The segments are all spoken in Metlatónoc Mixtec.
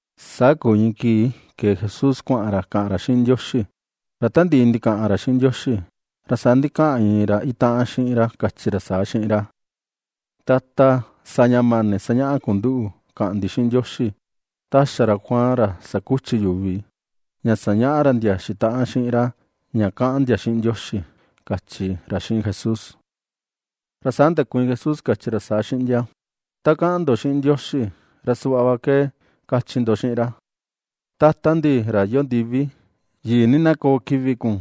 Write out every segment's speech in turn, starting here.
Saa kuu iin kii ke̱e Jesús kuaꞌan ra kaꞌan ra xiꞌin Ndioxi. Ra ta ndiꞌi ndikaꞌan ra xiꞌin Ndioxi, ra saa ndikaꞌan iin ra itaꞌan xiꞌin ra kachi ra saa xiꞌin ra: ―Tata, sa ña mani sañaꞌa kun nduꞌu kaꞌan ndi xiꞌin Ndioxi, ta xa ra Juan, ra sakuchi yuvi, ña sañaꞌa ra ndia xitaꞌan xiꞌin ra ña kaꞌan ndia xiꞌin Ndioxi ―kachi ra xiꞌin Jesús. Saa ndakuiin Jesús, kachi ra saa xiꞌin ndia: ―Ta kaꞌan ndo xiꞌin Ndioxi, ra suꞌva ke na kachi ndo xiꞌin ra: Tata ndi, ra iyoo ndivi, yii ni na koo kivi kun.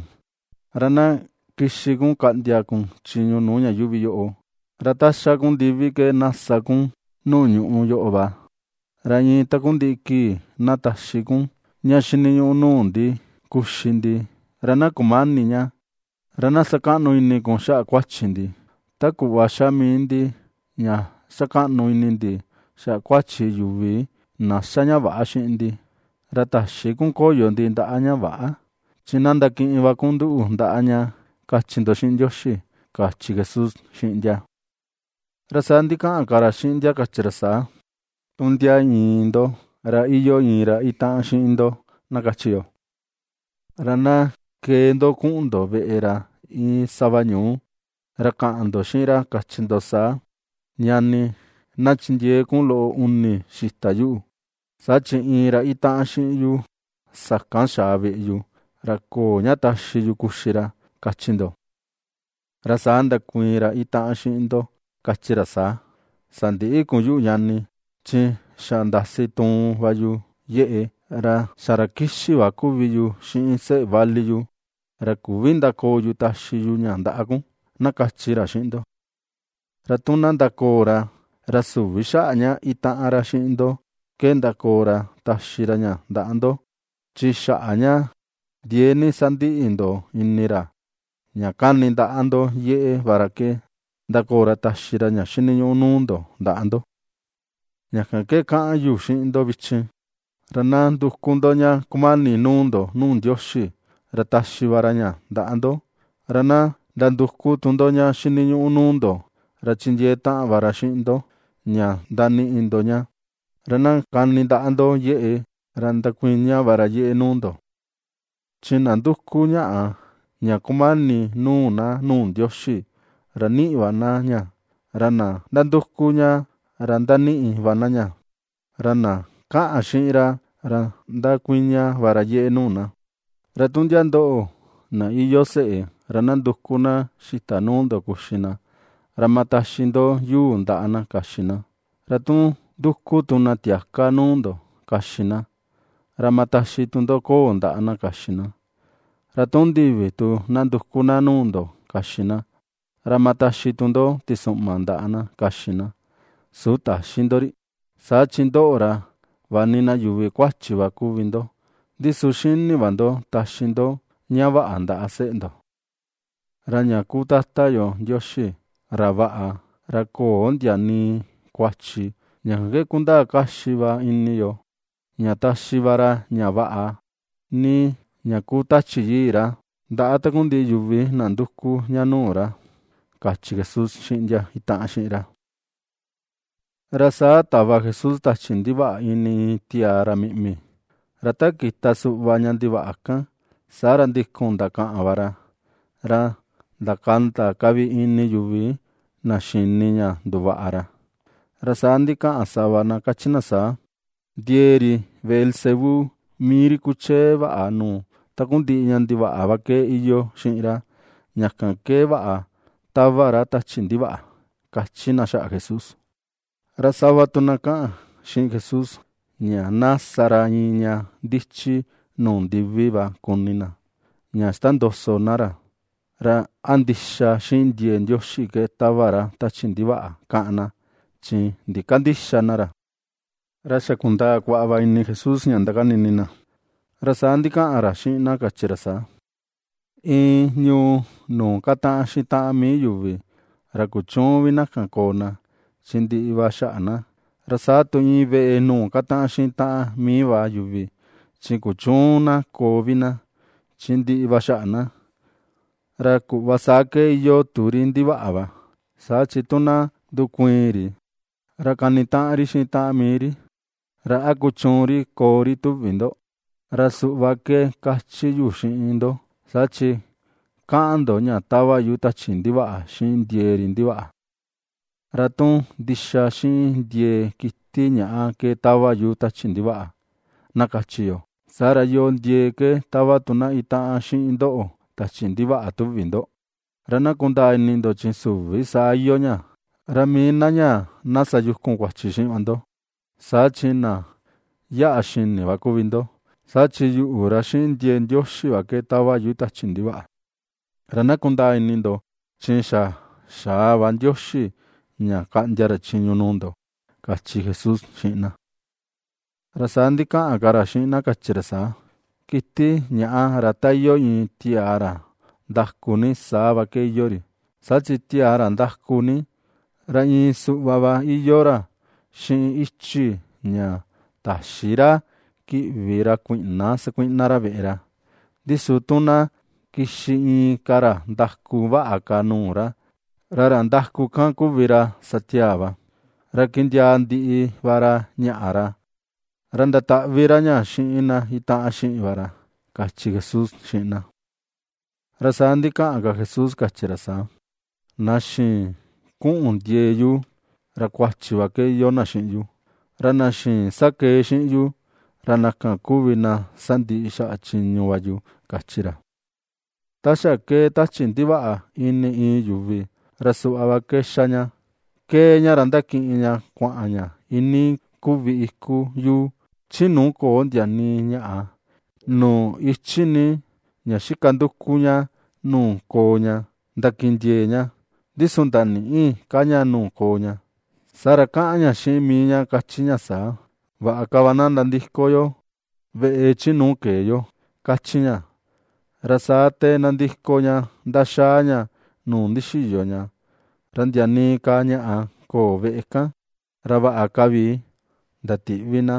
Ra na kixi kun kaꞌndia kun chiñu nuu ña yuuvi yoꞌo. Ra ta xa kun ndivi ke na sa kun nuu ñuꞌu yoꞌo va. Ra iin takundiꞌi kii na taxi kun ña xiniñuꞌu nuu ndi kuxi ndi; ra na kumäni ña. Ra na sakaꞌnu ini kun xaꞌa kuachi ndi, ta kuꞌva ^xa mii ndi ña ^xa kaꞌnu ini ndi xaꞌa kuachi yuvi na ^xa ña väꞌa xiꞌin ndi. Ra täxi kun koyo ndi ndaꞌa ña väꞌa; chi na ndakiꞌin va kun nduꞌu ndaꞌa ña, kachi ndo xiꞌin Ndioxi ―kachi Jesús xiꞌin ndia. Ra saa ndikaꞌan ka ra xiꞌin ndia kachi ra saa: ―Tu ndia iin ndo ra iyoo iin ra itaꞌan xiꞌin ndo, na kachi yo. Ra na kee ndo kuꞌun ndo veꞌe ra iin sava ñuu. Ra kaꞌan ndo xiꞌin ra, kachi ndo saa: “Ñani, na chindiee kun loꞌo uni xita yuꞌu. Saa chi iin ra itaꞌan xiꞌin yu sakan xaa veꞌe yu, ra köo ña taxi yu kuxi ra”, kachi ndo. Ra saa ndakuiin ra itaꞌan xiꞌin ndo kan, kachi ra saa: “Sandïꞌi kun yuꞌu ñani, chi xa ndasi tuun va yu yeꞌe. Ra xa ra kixi va kuvi yu xiꞌin seꞌe vali yu, ra küvi ndakoo yu taxi yu ña ndaꞌa kun”, na kachi ra xiꞌin ndo. Ra tu na ndakoo ra, ra süvi xaꞌa ña itaꞌan ra xiꞌin ndo ke ndakoo ra taxi ra ña ndaꞌa ndo. Chi xaꞌa ña ndiee ni sandiꞌi ndo ini ra, ña kani ndaꞌa ndo yeꞌe va ra ke, ndakoo ra taxi ra ña xiniñuꞌu nuu ndo ndaꞌa ndo. Ña kan ke kaꞌan yu xiꞌin ndo vichin: Ra na nduku ndo ña kumani nuu ndo nuu Ndioxi, ra taxi va ra ña ndaꞌa ndo; ra na nanduku ndo ña xiniñuꞌu nuu ndo, ra chindiee taꞌan va ra xiꞌin ndo ña ndaniꞌi ndo ña; ra na kani ndaꞌa ndo yeꞌe, ra ndakuiña va ra yeꞌe nuu ndo. Chi na nduku ñaꞌa ña kumani nuu na nuu Ndioxi, ra niꞌi va na ña; ra na nanduku ña, ra ndaniꞌi va na ña. Ra na kaꞌan xiꞌin ra, ra ndakuiña va ra yeꞌe nuu na. ’Ra tu ndia ndoꞌo na iyoo seꞌe, ra na nduku na xita nuu ndo kuxi na, ¿ra ama taxi ndo yuu ndaꞌa na kaxi na? Ra tu nduku tu na tiaka nuu ndo kaxi na, ¿ra ama taxi tu ndo koo ndaꞌa na kaxi na? Ra tu ndivi tu na nduku na nuu ndo kaxi na, ¿ra ama taxi tu ndo tisuꞌma ndaꞌa na kaxi na, su täxi ndo ri? Saa chi ndoꞌo, ra vaꞌa ni yuvi kuachi kuvi va ndo, ndi su xini va ndo taxi ndo ña vaꞌa ndaꞌa seꞌe ndo. ¡Ra ña kuu Tata yo Ndioxi, ra vaꞌa, ra köo ndia nii kuachi, ña kan ke kundaa kaxi va ini yo ña taxi va ra ña vaꞌa ni ña kuu Tachi Yii ra ndaꞌa takundiꞌi yuvi na nduku ña nuu ra! ―kachi Jesús xiꞌin ndia itaꞌan xiꞌin ra. Ra saa tava Jesús tachi ndivaꞌa ini iin tiaa ra miꞌmi. Ra ta kita suꞌva ña ndivaꞌa kan, saa ra ndikun ndakaꞌan va ra, ra ndakanda ka vi ini yuvi na xini ña nduvaꞌa ra. Ra saa ndikaꞌan sava na kachi na saa: ―Ndie̱e̱ ri Beelzebú, mii ri kuchee vaꞌa nuu takundiꞌi ña ndivaꞌa va ke iyoo xiꞌin ra, ña kan ke vaꞌa tava ra tachi ndivaꞌa. ―^kachi na xaꞌa Jesús. Ra sava tu na kaꞌan xiꞌin Jesús, ña na sa ra iin ña ndichi nuu ndivi va kuni na, ña ixtondoso na ra, ra a ndixa xiꞌin ndie̱e̱ Ndioxi ke tava ra tachi ndivaꞌa káꞌán na, chi ndikandïxa na ra. Ra xa kundaa kuaꞌa va ini Jesús ña ndakani ini na. Ra saa ndikaꞌan ra xiꞌin na kachi ra saa: ―Iin ñuu nuu kataꞌan xiꞌin taꞌan mii yuvi, ra kuchüun vi na ña koo na, chi ndiꞌi va xaꞌa na. Ra saa tu iin veꞌe nuu kataꞌan xiꞌin taꞌan mii va yuvi, chi kuchüun na koo vi na, chi ndiꞌi va xaꞌa na. Ra kuꞌva saa ke iyoo tu ri ndivaꞌa va, saa chi tu na ndukuiin ri, ra kanitaꞌan ri xiꞌin taꞌan mii ri. ¿Ra a kuchuun ri koo ri, tuvi ndo? Ra suꞌva ke kachi yu xiꞌin ndo, saa chi kaꞌan ndo ña tava yu tachi ndivaꞌa xiꞌin ndiee ri ndivaꞌa. Ra tu ndixa xiꞌin ndie̱e̱ kiti ñaꞌa ke tava yu tachi ndivaꞌa, na kachi yo, saa ra, ¿yoo ndiee ke tava tu na itaꞌan xiꞌin ndoꞌo tachi ndivaꞌa, tuvi ndo? Ra na kundaa ini ndo chi süvi saa iyoo ña. Ra mii na ñaa na sayukun kuachi xiꞌin va ndo, saa chi na yaꞌa xini va kuvi ndo. Saa chi yuꞌu, ra xiꞌin ndie̱e̱ Ndioxi va ke tava yu tachi ndivaꞌa. Ra na kundaa ini ndo chi xa xaa va Ndioxi ña kaꞌndia ra chiñu nuu ndo ―kachi Jesús xiꞌin na. Ra saa ndikaꞌan ka ra xiꞌin na kachi ra saa: ―Kiti ñaꞌa, ra ta iyoo iin tiaa ra ndaku ni, saa va ke iyoo ri. Saa chi tiaa ra ndaku ni, ra iin suꞌva va iyoo ra xiꞌin ichi ña täxi ra kiꞌvi ra kuiꞌna sakuiꞌna ra veꞌe ra. Ndi su tu na kixi inka ra ndaku vaꞌa ka nuu ra, ra ra ndaku kan kuvi ra sa tiaa va, ra kindiaa ndiꞌi va ra ñaꞌa ra. Ra ndataꞌvi ra ña xiꞌin na itaꞌan xiꞌin va ra ―kachi Jesús xiꞌin na. Ra saa ndikaꞌan ka Jesús kachi ra saa: ―Na xïin kuꞌun ndie̱e̱ yu, ra kuachi va ke iyoo na xiꞌin yu. Ra na xïin sakee xiꞌin yu, ra na kan kuvi na sandiꞌi xaꞌa chiñu va yu ―kachi ra. Ra saa ndikaꞌan ka Jesús kachi ra saa: ―Ta xa kee tachi ndivaꞌa ini iin yuvi ra suꞌva va ke xa ña: ^kee ña ra ndakiꞌin ña kuaꞌan ña iinii kuvi iku yuu, chi nuu köo ndia nii ñaꞌa, nuu ichi ni, ña xika nduku ña nuu koo ña ndakindiee ña, ndi su ndanïꞌi ka ña nuu koo ña. Saa ra kaꞌan ña xiꞌin mii ña kachi ña saa: “Vaꞌa ka va na nandiko yo veꞌe chi nuu kee yo”, kachi ña. Ra saa te nandiko ña ndaxaa ña nuu ndixiyo ña, ra ndia nii ka ñaꞌa köo veꞌe kan, ra vaꞌa ka vi ndatiꞌvi na,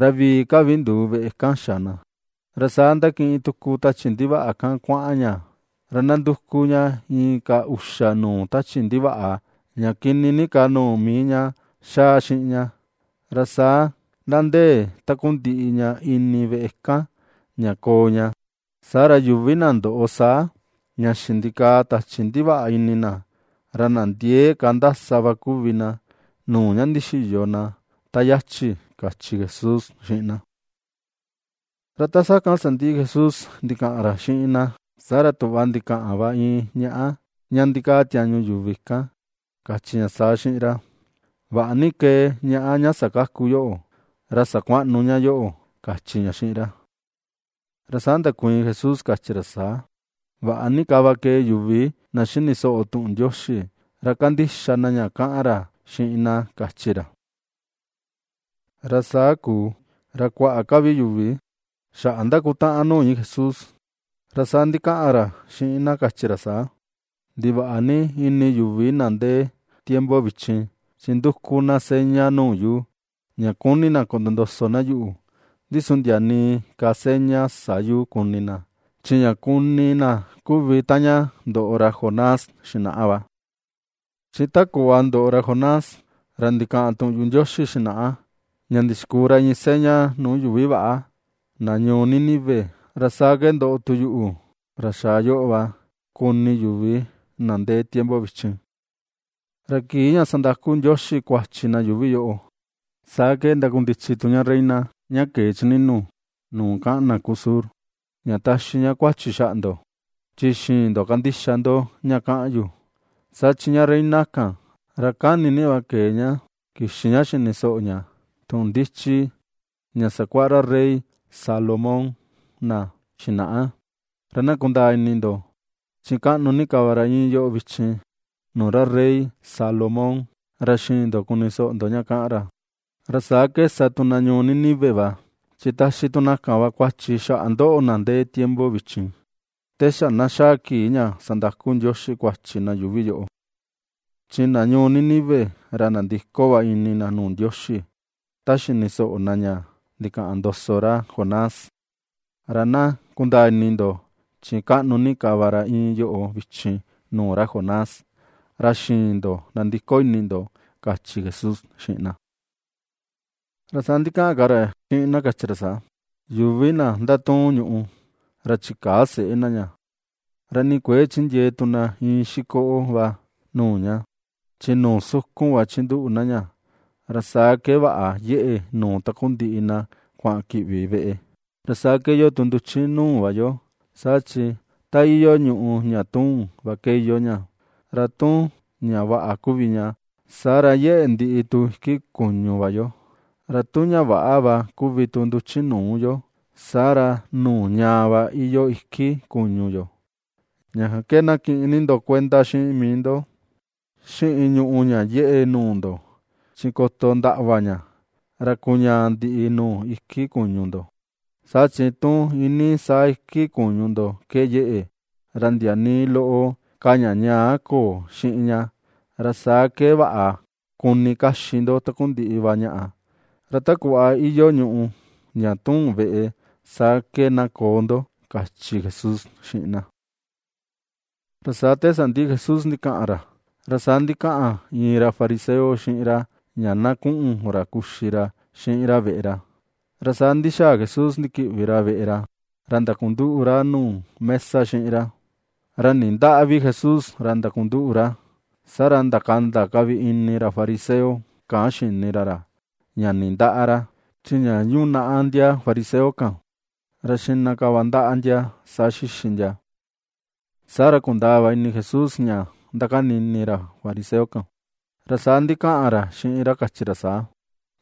ra vii ka vi nduu veꞌe kan xa na. Ra saa ^ndakiꞌin tuku tachi ndivaꞌa kan kuaꞌan ña, ra ^nanduku ña inka uxa nuu tachi ndivaꞌa, ña kini ni ka nuu mii ña ^xaa xiꞌin ña, ra saa ^nandee takundiꞌi ña ini veꞌe kan, ña koo ña. Saa ra yuvi na ndoꞌo saa ña xindikaa tachi ndivaꞌa ini na, ra na ndiee ka ndasa va kuvi na, nuu ña ndixiyo na ta yachi ―kachi Jesús xiꞌin na. Ra ta sakan sandiꞌi Jesús ndikaꞌan ra xiꞌin na, saa ra tuꞌva ndikaꞌan va iin ñaꞌa ña ndikaa tiañu yuvi kan kachi ña saa xiꞌin ra: ―Vaꞌa ni kee ñaꞌa ña sakaku yoꞌo, ra sakuaꞌnu ña yoꞌo ―kachi ña xiꞌin ra. Ra saa ndakuiin Jesús kachi ra saa: ―Vaꞌa ni ka va kee yuvi na xini soꞌo tuꞌun Ndioxi, ra kandixa na ña kaꞌan ra xiꞌin na ―kachi ra. Ra saa kuu ra kuaꞌa ka vi yuvi xaꞌa ^ndakutaꞌan nuu iin Jesús, ra saa ndikaꞌan ra xiꞌin na kachi ra saa: ―¡Ndivaꞌa ni ini yuvi na ndee tiempo vichin! Chi nduku na seña nuu yu, ña kuni na kotondoso na yuꞌu. Ndi su ndia nii ka seña sä yu kuni na. Chi ña kuni na kuvi taꞌan ña ndoꞌo ra Jonás xinaꞌa va. Chi ta kuꞌva ndoꞌo ra Jonás, ra ndikaꞌan tuꞌun yuꞌu Ndioxi xinaꞌa, ña ndixikuu ra iin seña nuu yuvi väꞌa, na ñuu Nínive, ra saa ke ndoꞌo tu yuꞌu, ra xaa yoꞌo va, kuni yuvi na ndee tiempo vichin. Ra kii ña sandaku Ndioxi kuachi na yuuvi yoꞌo, saa ke ndakundichi tu ña reina ña kee chi nínu̱ nuu kaꞌan na kuu sur, ña taxi ña kuachi xaꞌa ndo. Chi xïin ndo kandixa ndo ña kaꞌan yu. Saa chi ña reina kan, ra kani ni va ke̱e ña kixi ña xini soꞌo ña tuꞌun ndichi ña sakuaꞌa ra rey Salomón na xinaꞌa. Ra na kundaa ini ndo, chi kaꞌnu ni ka va ra iin yoꞌo vichin nuu ra rey Salomón, ra xïin ndo kuni soꞌo ndo ña kaꞌan ra. Ra saa ke sa tu na ñuu Nínive va, chi taxi tu na kan va kuachi xaꞌa ndoꞌo na ndee tiempo vichin, te xa na xaa kii ña sandaku Ndioxi kuachi na yuuvi yoꞌo. Chi na ñuu Nínive, ra nandiko va ini na nuu Ndioxi ta xini soꞌo na, ña ndikaꞌan ndoso ra Jonás, ra na kundaa ini ndo, chi kaꞌnu ni ka va ra iin yoꞌo vichin nuu ra Jonás, ra xïin ndo nandiko ini ndo ―kachi Jesús xiꞌin na. Ra saa ndikaꞌan ka ra xiꞌin na kachi ra saa: ―Yuvi na ndatuun ñuꞌu, ra chikäa seꞌe na ña, ra nii kuëe chindiee tu na iin xikoꞌo va nuu ña. Chi nuu sukun va chinduꞌu na ña, ra saa ke vaꞌa yeꞌe nuu takundiꞌi na kuaꞌan kiꞌvi veꞌe. Ra saa ke iyoo tu nduchi nuu va yo, saa chi ta iyoo ñuꞌu ña tuun, va ke iyoo ña. Ra tu ña vaꞌa kuvi ña, saa ra yeꞌe ndiꞌi tu iki kuñu va yo, ra tu ña väꞌa va kuvi tu nduchi nuu yo, saa ra nuu ñaa va iyoo iki kuñu yo. Ña kan ke na kiꞌin ni ndo kuenda xiꞌin mii ndo xiꞌin ñuꞌu ña yeꞌe nuu ndo; chi koto ndaꞌva ña, ra kuñaa ndiꞌi nuu iki kuñu ndo. Saa chi tu iinii saa iki kuñu ndo ke yeꞌe, ra ndia nii loꞌo ka ña ñaa köo xiꞌin ña, ra saa ke vaꞌa kuni kaxi ndo takundiꞌi va ñaꞌa, ra ta kuꞌva iyoo ñuꞌu ña tuun veꞌe, saa ke na koo ndo ―kachi Jesús xiꞌin na. Ra saa te sandiꞌi Jesús ndikaꞌan ra, ra saa ndikaꞌan iin ra fariseo xiꞌin ra ña na kuꞌun ra kuxi ra xiꞌin ra veꞌe ra. Ra saa ndixaa Jesús ndikiꞌvi ra veꞌe ra, ra ndakunduꞌu ra nuu mesa xiꞌin ra. Ra nindäꞌa vi Jesús ra ndakunduꞌu ra. Saa ra ndakanda ka vi ini ra fariseo kan xini ra ra ña nindäꞌa ra, chi ña yunaꞌa ndia fariseo kan, ra xiꞌna ka va ndaꞌa ndia a saa xixi ndia. Saa ra kundaa va ini Jesús ña ^ndakani ini ra fariseo kan, ra saa ndikaꞌan ra xiꞌin ra, kachi ra saa: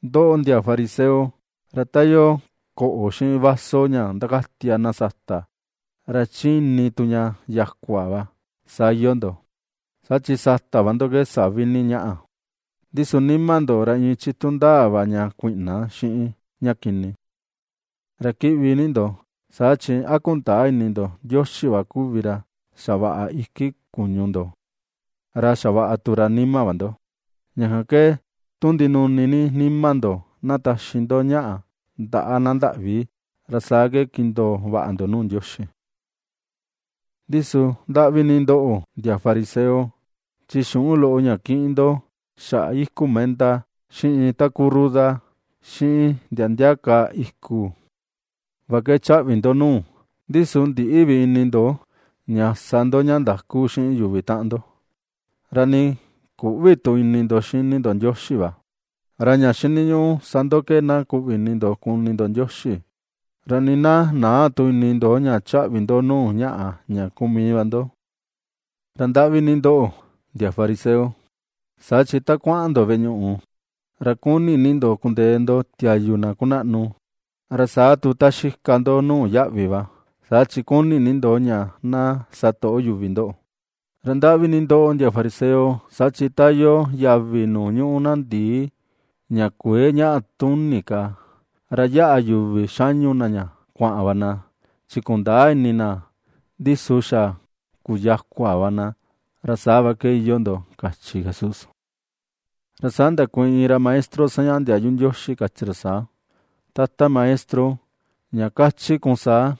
―Ndoꞌo, ndia fariseo, ra ta iyoo koꞌo xiꞌin vaso ña ndakatia na sata, ra chi ini tu ña yakua va, saa iyoo ndo. Saa chi sata va ndo ke savi ni ñaꞌa, ndi su nima ndo, ra iin chitu ndaa va ña kuiꞌna, xiꞌin ña kini. ¡Ra Kiꞌvi ni ndo!, saa chi, ¿a kundäa ini ndo Ndioxi va kuvi ra xavaꞌa iki kuñu ndo, ra xavaꞌa tu ra nima va ndo? Ña kan ke tu ndinuni ni nima ndo na taxi ndo ñaꞌa ndaꞌa na ndaꞌvi, ra saa ke kindoo vaꞌa ndo nuu Ndioxi. ’Ndi su, ¡Ndaꞌvi ni ndoꞌo, ndia fariseo!, chi xuꞌun loꞌo ña kiꞌin ndo xaꞌa iku menta, xiꞌin takuu ruda, xiꞌin ndia ndia ka iku, va ke chaꞌvi ndo nuu. Ndi su ndïꞌi vi ini ndo ña sa ndo ña ndaku xiꞌin yuvi taꞌan ndo; ra ni küꞌvi tu ini ndo xini ndo Ndioxi va. Ra ña xiniñuꞌu sa ndo ke na kuꞌvi ini ndo kuni ndo Ndioxi, ra nii na näa tu ini ndo ña chaꞌvi ndo nuu ñaꞌa ña kuu mii va ndo. ’¡Ra ndaꞌvi ni ndoꞌo, ndia fariseo!, saa chi ta kuaꞌan ndo veꞌe ñuꞌu ra kuni ni ndo kundee ndo tiayu na kunaꞌnu; ra saa tu ta xika ndo nuu yaꞌvi va, saa chi kuni ni ndo ña na satoꞌo yuvi ndoꞌo. ’¡Ra ndaꞌvi ni ndoꞌo, ndia fariseo!, saa chi ta iyoo yavi nuu ñuꞌu ndii ña kuëe ñaꞌa tuni ka, ra yaꞌa yuvi xañu na ña kuaꞌan va na, chi kundäa ini na, ndi su xa kuyakua va na, ra saa va ke iyoo ndo ―kachi Jesús. Ra saa ndakuiin iin ra maestro sañaꞌa ndiayu Ndioxi, kachi ra saa: ―Tata Maestro, ña kachi kun saa,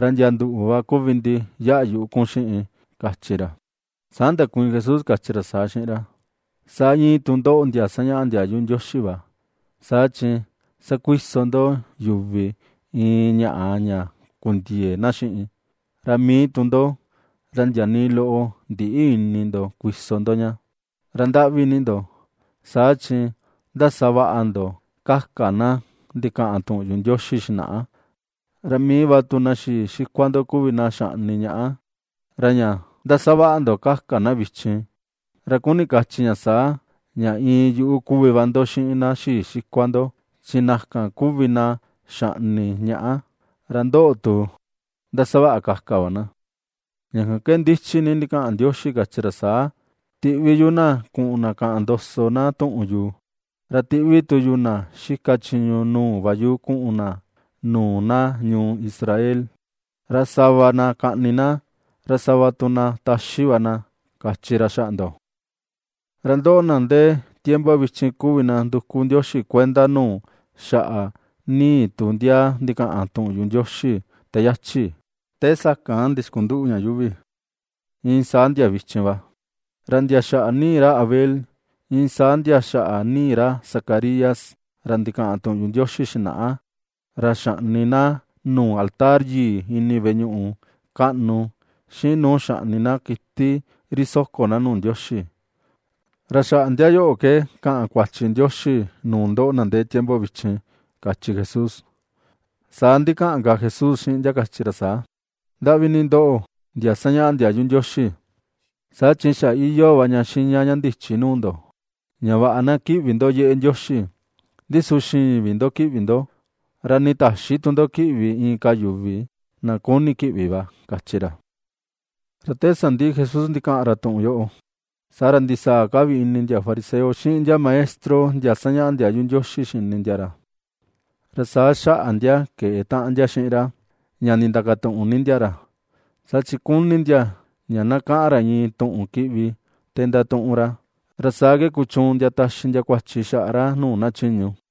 ra ndia nduꞌu va kuvi ndi yaꞌa yuꞌu kun xiꞌin ―kachi ra. Saa ndakuiin Jesús, kachi ra saa xiꞌin ra: ―¡Saa iin tu ndoꞌo, ndia sañaꞌa ndiayu Ndioxi va! Saa chi sakuiso ndo yuvi iin ñaꞌa ña kundiëe na xiꞌin; ra mii tu ndo, ra ndia nii loꞌo ndïꞌi ini ndo kuiso ndo ña. ’¡Ra ndaꞌvi ni ndo! Saa chi ndasavaꞌa ndo kaka na ndikaꞌan tuꞌun yuꞌu Ndioxi xinaꞌa, ra mii va tu na xii xikua ndo kuvi na xaꞌni ñaꞌa. Ra ña ndasavaꞌa ndo kaka na vichin, ra kuni kachi ña saa, ña iin yuꞌu kuvi va ndo xiꞌin na xii xikua ndo; chi na kan kuvi na xaꞌni ñaꞌa, ra ndoꞌo tu ndasavaꞌa kaka va na. ’Ña kan ke ndichi ni ndikaꞌan Ndioxi kachi ra saa: “Tiꞌvi yu na kuꞌun na kaꞌan ndoso na tuꞌun yu, ra tiꞌvi tu yu na xika chiñu nuu va yu kuꞌun na nuu na ñuu Israel, ra sava na kaꞌni na; ra sava tu na taxi va na”, kachi ra xaꞌa ndo. Ra ndoꞌo, na ndee vichin kuvi na nduku Ndioxi kuenda nuu xaꞌa nii tu ndia ndikaꞌan tuꞌun yuꞌu Ndioxi te yachi, te sakan ndixkunduꞌu ña yuuvi, iin saa ndia vichin va. Ra ndia xaꞌa nii ra Abel, iin saa ndia xaꞌa nii ra Zacarías ra ndikaꞌan tuꞌun yuꞌu Ndioxi xinaꞌa, ra xaꞌni na nuu altar yii ini veꞌe ñuꞌu kaꞌnu, xiꞌin nuu xaꞌni na kiti ri soko na nuu Ndioxi. Ra xaꞌa ndia yoꞌo ke kaꞌan Ndioxi kuachi nuu ndoꞌo, na ndee tiempo vichin ―kachi Jesús. Ra saa ndikaꞌan ka Jesús xiꞌin ndia kachi ra saa: ―¡Ndaꞌvi ni ndoꞌo ndia sañaꞌa ndiayu Ndioxi! Saa chi xa iyoo va ña xiña ña ndichi nuu ndo, ña vaꞌa na kiꞌvi ndo yeꞌe Ndioxi, ndi su xïin ndo kiꞌvi ndo, ra nii täxi tu ndo kiꞌvi inka yuvi, na kuni kiꞌvi va ―kachi ra. Ra te sandiꞌi Jesús ndikaꞌan ra tuꞌun yoꞌo, saa ra ndisaa ka vi ini ndia fariseo xiꞌin ndia maestro ndia sañaꞌa ndiayu Ndioxi xini ndia ra. Ra saa xaꞌa ndia keꞌe taꞌan ndia xiꞌin ra, ña ndindakatuꞌun ni ndia ra. Saa chi kuni ndia ña na kaꞌan ra iin tuꞌun kiꞌvi te ndatuꞌun ra. Ra saa ke kuchuun ndia taxi ndia kuachi xaꞌa ra nuu na chiñu.